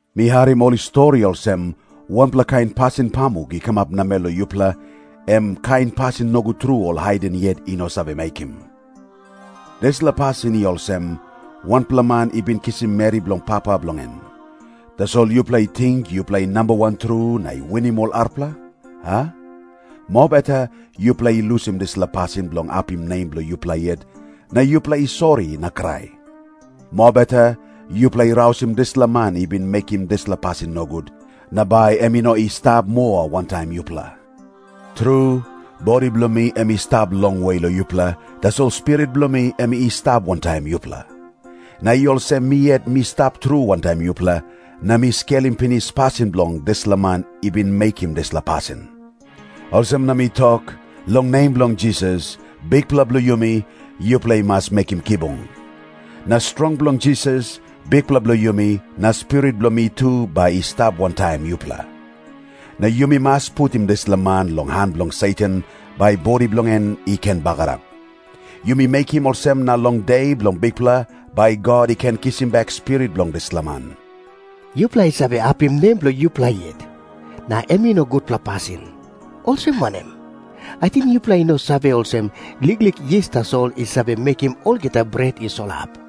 Mi harim ol i stori olsem, wanpela kain pasin pamuk i kamap namel long yupela, em kain pasin nogut tru ol haiden yet i no save mekim. Dispela pasin i olsem, wanpela man i bin kisim meri bilong papa bilong en. Tasol yupela i ting yupela i nambawan tru na i winim ol arapela, a? Mobeta yupela i lusim dispela pasin bilong apim nem bilong yupela yet, na yupela i sori na krai. Mobeta yupela i rausim dispela man i bin mekim dispela pasin nogut, na bai em i no i stap moa wantaim yupela. Tru, bodi bilong mi em i stap longwe long yupela, tasol spirit bilong mi em i stap wantaim yupela. Na i olsem mi yet mi stap tru wantaim yupela, na mi skelim pinis pasin bilong dispela man i bin mekim dispela pasin. Olsem na mi tok, long nem bilong Jisas, Bikpela bilong yumi, yupela i mas mekim kibung. Na strong bilong Jisas, Bikpela bilong yumi, na spirit bilong mi tu bai i stap wantaim yupela. Na yumi mas putim dispela man long han bilong Satan, bai bodi bilong en i ken bagarap. Yumi mekim olsem na long De bilong Bikpela bai God i ken kisim bek spirit bilong dispela man. Yupela i save apim nem bilong yupela yet, na em i no gutpela pasin. Olsem wanem? Ating yupela i no save olsem, liklik yis tasol i save mekim olgeta bret i solap?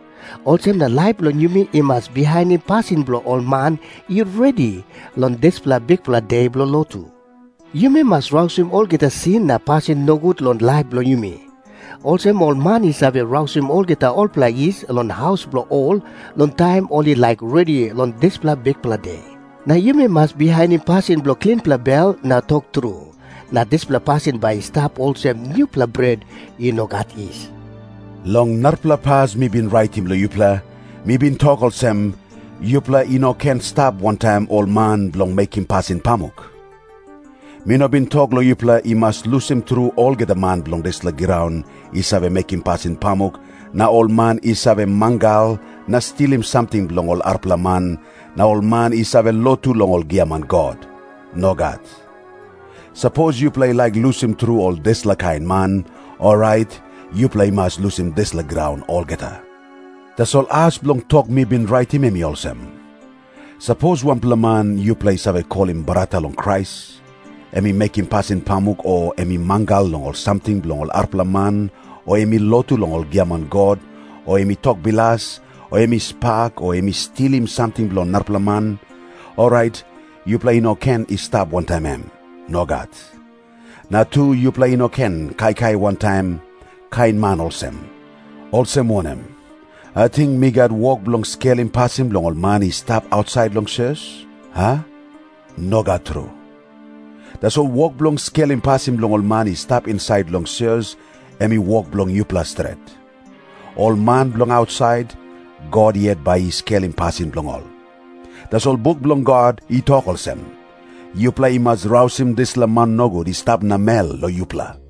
Olsem na laip bilong yumi i mas bihainim pasin bilong ol man i redi long dispela bikpela de bilong lotu. Yumi mas rausim olgeta sin na pasin nogut long laip bilong yumi, olsem ol man i save rausim olgeta olpela yis long haus bilong ol long taim ol i laik redi long dispela bikpela de. Na yumi mas bihainim pasin bilong klinpela bel na tok tru, na dispela pasin bai i stap olsem nupela bret i no gat yis. Long narapela pas mi bin raitim long yupela, mi bin tok olsem, “Yupela i no ken stap wantaim ol man bilong mekim pasin pamuk.” Mi no bin tok long yupela i mas lusim tru olgeta man bilong dispela graun i save mekim pasin pamuk, na ol man i save mangal na stilim samting bilong ol arapela man, na ol man i save lotu long ol giaman god. Nogat. Sapos yupela i laik lusim tru ol dispela kain man, orait yupela i mas lusim dispela graun olgeta. Tasol as bilong tok mi bin raitim em i olsem. Sapos wanpela man yupela i save kolim brata long Krais, em i mekim pasin pamuk o em i mangal long ol samting bilong ol arapela man o em i lotu long ol giaman god o em i tok bilas o em i spak o em i stilim samting bilong narapela man, orait yupela i no ken i stap wantaim em. Nogat. Na tu, yupela i no ken kaikai wantaim kain man olsem. Olsem wanem? Ating mi gat wok bilong skelim pasin bilong ol man i stap ausait long sios, a? Nogat tru. Tasol wok bilong skelim pasin bilong ol man i stap insait long sios, em i wok bilong yupela stret. Ol man bilong ausait, God yet bai i skelim pasin bilong ol. Tasol buk bilong God i tok olsem, “Yupela i mas rausim dispela man nogut i stap namel long yupela.”